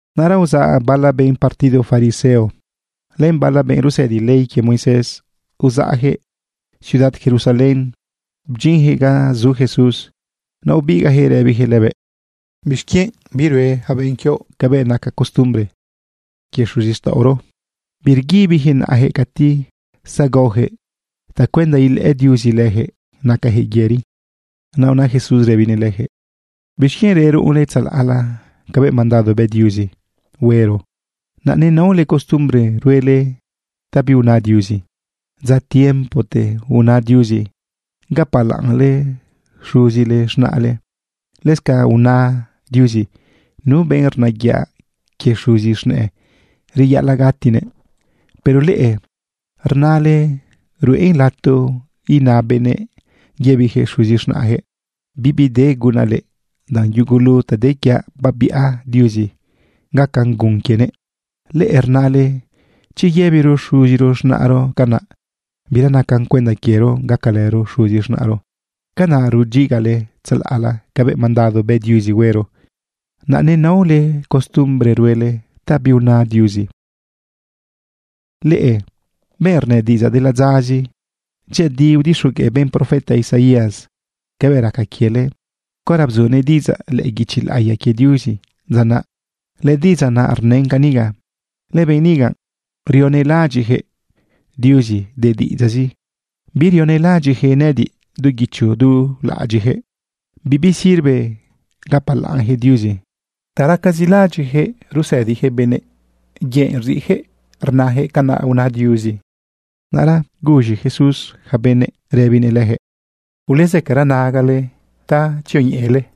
Naꞌra uzaꞌ bala benꞌ partido fariseo len bala benꞌ rusëdi ley quie Moisés, uzaꞌjëꞌ ciudad Jerusalén bdyinjëꞌ ga zu Jesús. Naꞌ ubigaꞌjëꞌ rëbijëꞌ lëbëꞌ: ―¿Bixquienꞌ birue ja benꞌ quioꞌ cabëꞌ naca costumbre quie xuzixtaꞌoro? Birguibijëꞌ naꞌajëꞌ cati zagaojëꞌ tacuenda ilëꞌë Diuzi lëjëꞌ nacajëꞌ yëri. Naꞌ una Jesús rëbinëꞌ lëjëꞌ: ―¿Bixquienꞌ reruꞌunle tzalaꞌla cabëꞌ mandado bë Diuzi huero, naꞌ nenaole costumbre ruele ta biuna Diuzi? Dza tiempote una Diuzi: “Gapalaꞌnle xuzi z̃naꞌle.” Lëscanꞌ una Diuzi: “Nu benꞌ rnayaꞌ quie xuzi z̃nëꞌë, reyaꞌalaꞌ gatinëꞌ.” Pero leꞌe rnale ruꞌen lato ina benëꞌ yëbijëꞌ xuzi z̃naꞌjëꞌ: “Bibi de gunaꞌ leꞌe, danꞌ yugulu ta de quiaꞌ babiꞌa Diuzi gacan gun quienëꞌ.” Leꞌe rnale chi yëbiro xuzi z̃naꞌro canaꞌ, bira nacan cuenda quiero gacalëro xuzi z̃naꞌro. Canaꞌ rudyigale tzalaꞌla cabëꞌ mandado bë Diuzi huero, naꞌ nenaole costumbre ruele ta biuna Diuzi. ¡Leꞌe benꞌrnë diꞌidzaꞌ de ladzazi! Dyëꞌëdi udixogueꞌ benꞌ profeta Isaías cabëꞌ raca quiele caora bzunëꞌ diꞌidzaꞌ lëꞌë guichi laꞌiya quie Diuzi dza naꞌ. Lëdiꞌidzaꞌ naꞌ rnën caniga: Lëbenꞌ niga rionelaꞌadyiꞌjëꞌ Diuzi de diꞌidzaꞌzi, birionelaꞌadyiꞌjëꞌ nëꞌëdiꞌ du guicho du laꞌadyiꞌjëꞌ. Bibi sirve gapalaꞌnjëꞌ Diuzi. Ta racazi laꞌadyiꞌjëꞌ rusëdijëꞌ benëꞌ, yëꞌ rziꞌjëꞌ rnajëꞌ canaꞌ una Diuzi. Naꞌra guz̃i Jesús ja benëꞌ rëbinëꞌ lëjëꞌ: ―Ulezëcara nagale ta tzioñeꞌele: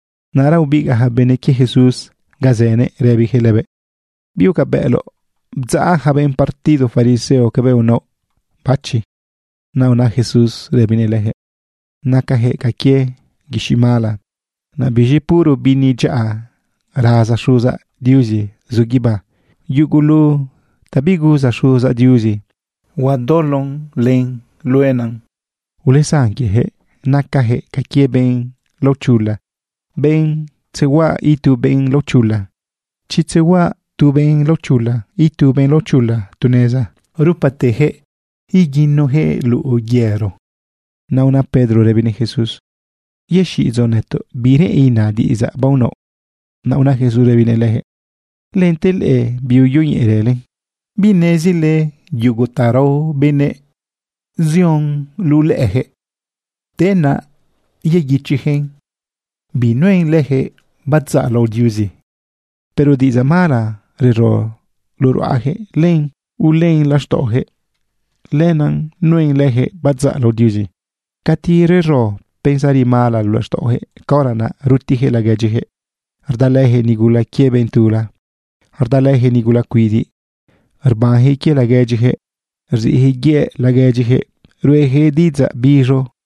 Naꞌra ubigaꞌ ja benꞌ quie Jesús ga zënëꞌ rëbijëꞌ lëbëꞌ: ―¿Bigucabëꞌloꞌ bdzaꞌ ja benꞌ partido fariseo cabëꞌ unaoꞌ bachi? Naꞌ una Jesús rëbinëꞌ lëjëꞌ: ―Nacajëꞌ ca quie guixiꞌ mala. Naꞌ biz̃i puro bini dyaꞌa raza Xuzaꞌ Diuzi zu guibá. Yugulu ta biguza Xuzaꞌ Diuzi, huadolon len luenan. Ulesan quiejëꞌ. Nacajëꞌ ca quie benꞌ laochula, benꞌ tzehuaꞌa itu benꞌ laochula. Chi tzehuaꞌa tu benꞌ laochula itu benꞌ laochula tu neza, rupatejëꞌ iguinujëꞌ luꞌu yëro. Naꞌ una Pedro rëbinëꞌ Jesús: ―Yexiꞌidzoꞌ nëtoꞌ bi reꞌen ina diꞌidzaꞌ baonaoꞌ. Naꞌ una Jesús rëbinëꞌ lëjëꞌ: ―¿Lente leꞌe biuyoñeꞌerële? ¿Binezile yugu ta rao benëꞌ zion luꞌu lëꞌëjëꞌ, te naꞌ yeguichijëꞌn binuen lëjëꞌ badzaꞌ lao Diuzi? Pero diꞌidzaꞌ mala rero luꞌu ruꞌajëꞌ, len ulën laxtaꞌojëꞌ. Lenaꞌ nuen lëjëꞌ badzaꞌ lao Diuzi. Cati rero pensari mala luꞌu laxtaꞌojëꞌ, caora naꞌ rutijëꞌ laguedyijëꞌ, rdalëjëꞌ nigula quie benꞌ tula, rdalëjëꞌ nigula cuidiꞌ, rbanjëꞌ quie laguedyijëꞌ, rziꞌjëꞌ yëꞌ laguedyijëꞌ, ruꞌejëꞌ diꞌidzaꞌ biz̃o.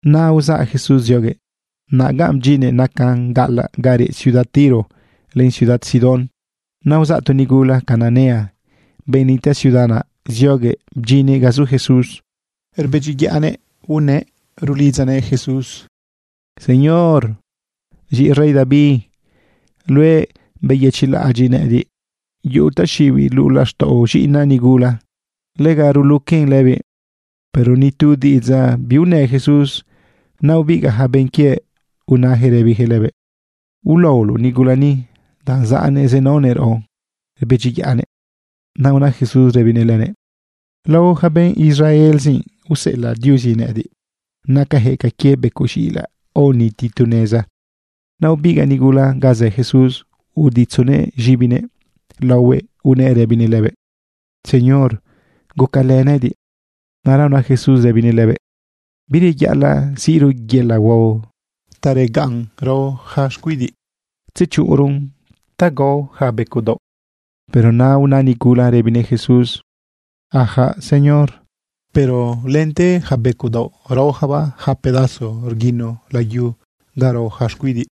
Naꞌ uzaꞌ Jesús zioguëꞌ. Naꞌ ga bdyinnëꞌ nacan gaꞌalaꞌ ga reꞌ ciudad Tiro len ciudad Sidón. Naꞌ uzaꞌ tu nigula Cananea, benꞌ nitaꞌ ciudad naꞌ, zioguëꞌ bdyinnëꞌ ga zu Jesús. Rbedyiyaꞌnëꞌ unëꞌ rulidzanëꞌ Jesús: ―Señor, z̃iꞌi rey David luëꞌ, beyëchiꞌlaꞌadyiꞌ nëꞌëdiꞌ. Yuꞌu taxiꞌibiꞌ luꞌu laxtaꞌo z̃iꞌinaꞌ nigula. Lega ruluquen lëbiꞌ. Pero ni tu diꞌidzaꞌ biunë Jesús. Naꞌ ubigaꞌ ja benꞌ quiëꞌ unajëꞌ rëbijëꞌ lëbëꞌ: ―Ulaoloꞌ nigula ni, danꞌ zaꞌnëꞌ zenaonëꞌ raꞌo, rbedyiyaꞌnëꞌ. Naꞌ una Jesús rëbinëꞌ lëbëꞌ: ―Lao ja benꞌ Israelzi aoseꞌelaꞌ Diuzi nëꞌëdiꞌ. Nacajëꞌ ca quie becoꞌ z̃iꞌilaꞌ aoniti tu neza. Naꞌ ubigaꞌ nigula ga zë Jesús, uditzunëꞌ z̃ibinëꞌ laohuëꞌ unëꞌ rëbinëꞌ lëbëꞌ: ―Señor, gucalë nëꞌëdiꞌ. Naꞌra una Jesús rëbinëꞌ lëbëꞌ: ―Bireyaꞌalaꞌ siꞌro yelaꞌ huao ta regaꞌn rao yaca xcuidiꞌ, tzechuꞌunron ta gao yaca becoꞌ daoꞌ. Pero naꞌ una nigula naꞌ rëbinëꞌ Jesús: ―Sí, Señor, pero lente yaca becoꞌ daoꞌ raoyacabaꞌ yaca pedazo rguino layu ga rao yaca xcuidiꞌ.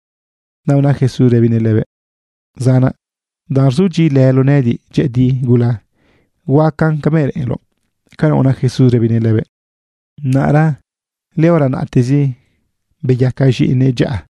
Naꞌ una Jesús rëbinëꞌ lëbëꞌ: ―Zanaꞌ, danꞌ rzudyiꞌilëloꞌ nëꞌëdiꞌ dyëꞌëdi gula, huacan cabëꞌ reꞌenloꞌ. ―Canaꞌ una Jesús rëbinëꞌ lëbëꞌ. Naꞌra lëhora naꞌtezi, beyaca z̃iꞌinëꞌ dyaꞌa.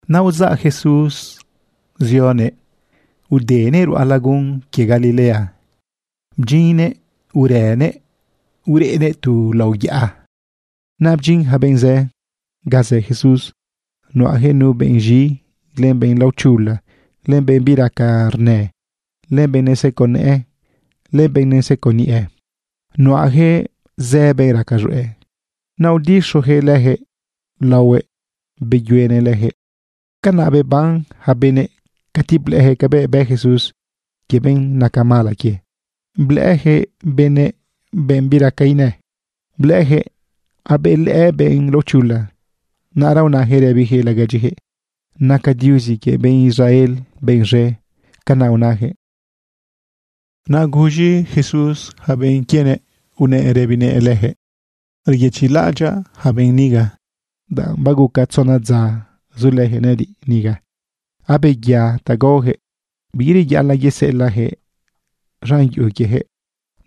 Naꞌ uzaꞌ Jesús zioguëꞌ udenëꞌ ruꞌa lagun quie Galilea, bdyinnëꞌ urënëꞌ ureꞌnëꞌ tu lao yaꞌa. Naꞌ bdyin ja benꞌ zë ga zë Jesús. Nuꞌajëꞌ nu benꞌ z̃i, len benꞌ laochula, len benꞌ biraca rnë, len benꞌ neseco nëꞌë, len benꞌ neseco niꞌe. Nuꞌajëꞌ zë benꞌ raca z̃hueꞌ. Naꞌ udixojëꞌ lëjëꞌ laohuëꞌ, beyuenëꞌ lëjëꞌ. Canaꞌ beban ja benëꞌ cati blëꞌëjëꞌ cabëꞌ bë Jesús quie benꞌ naca mala quie. Blëꞌëjëꞌ benë benꞌ biraca inë, blëꞌëjëꞌ abelëꞌë benꞌ laochula. Naꞌra unajëꞌ rëbijëꞌ laguedyijëꞌ: “Naca Diuzi quie benꞌ Israel benꞌ z̃e.” Canaꞌ unajëꞌ. Naꞌ guz̃i Jesús yaca benꞌ quienëꞌ unëꞌ rëbinëꞌ lëjëꞌ: ―Reyëchiꞌlaꞌadyaꞌ yaca benꞌ niga, danꞌ baguca tzona dza zulëjëꞌ nëꞌëdiꞌ niga, abeya ta gaojëꞌ. Bireyaꞌalaꞌ yeseꞌelaꞌjëꞌ z̃an yuꞌu quiejëꞌ,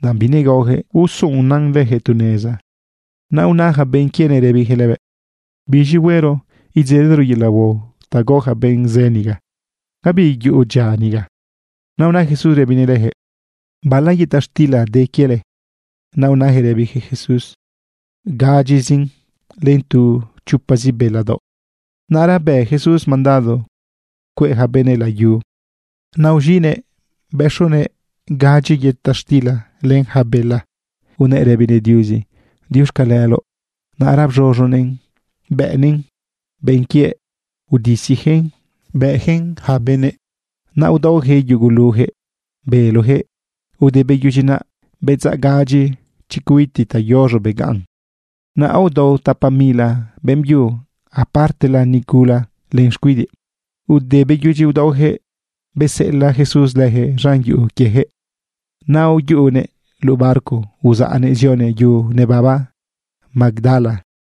danꞌ binegaojëꞌ usuꞌunan lëjëꞌ tu neza. Naꞌ una ja benꞌ quienëꞌ rëbijëꞌ lëbëꞌ: ―Biz̃i huero idzelero yelaꞌ huao ta gao ja benꞌ zë niga. Gabi yuꞌu dyia ni. Naꞌ una Jesús rëbinëꞌ lëjëꞌ: ―¿Bala yëta xtila de quiele? Naꞌ unajëꞌ rëbijëꞌ Jesús: ―Gadyizin len tu chopazi bela daoꞌ. Naꞌ ra bë Jesús mandado cueꞌ ja benëꞌ layu. Naꞌ uz̃iꞌnëꞌ bëxunëꞌ gadyi yëta xtila len ja bela, unëꞌ rëbinëꞌ Diuzi: “Diuxcaleloꞌ”. Naꞌra bz̃uz̃unëꞌn bëꞌnëꞌn benꞌ quiëꞌ, udisijëꞌn bëꞌjëꞌn yaca benëꞌ. Naꞌ aodaojëꞌ yugulujëꞌ belojëꞌ. Ude beyudyi naꞌ, bedzaꞌ gadyi chicuiti tayoz̃o begaꞌn. Naꞌ aodao tapa mila beꞌmbyu, apartela nigula len xcuidiꞌ. Ude beyudyi udaojëꞌ, beseꞌelaꞌ Jesús lëjëꞌ z̃an yuꞌu quiejëꞌ. Naꞌ uyuꞌunëꞌ luꞌu barco uzaꞌnëꞌ zionëꞌ yu nebaba Magdala.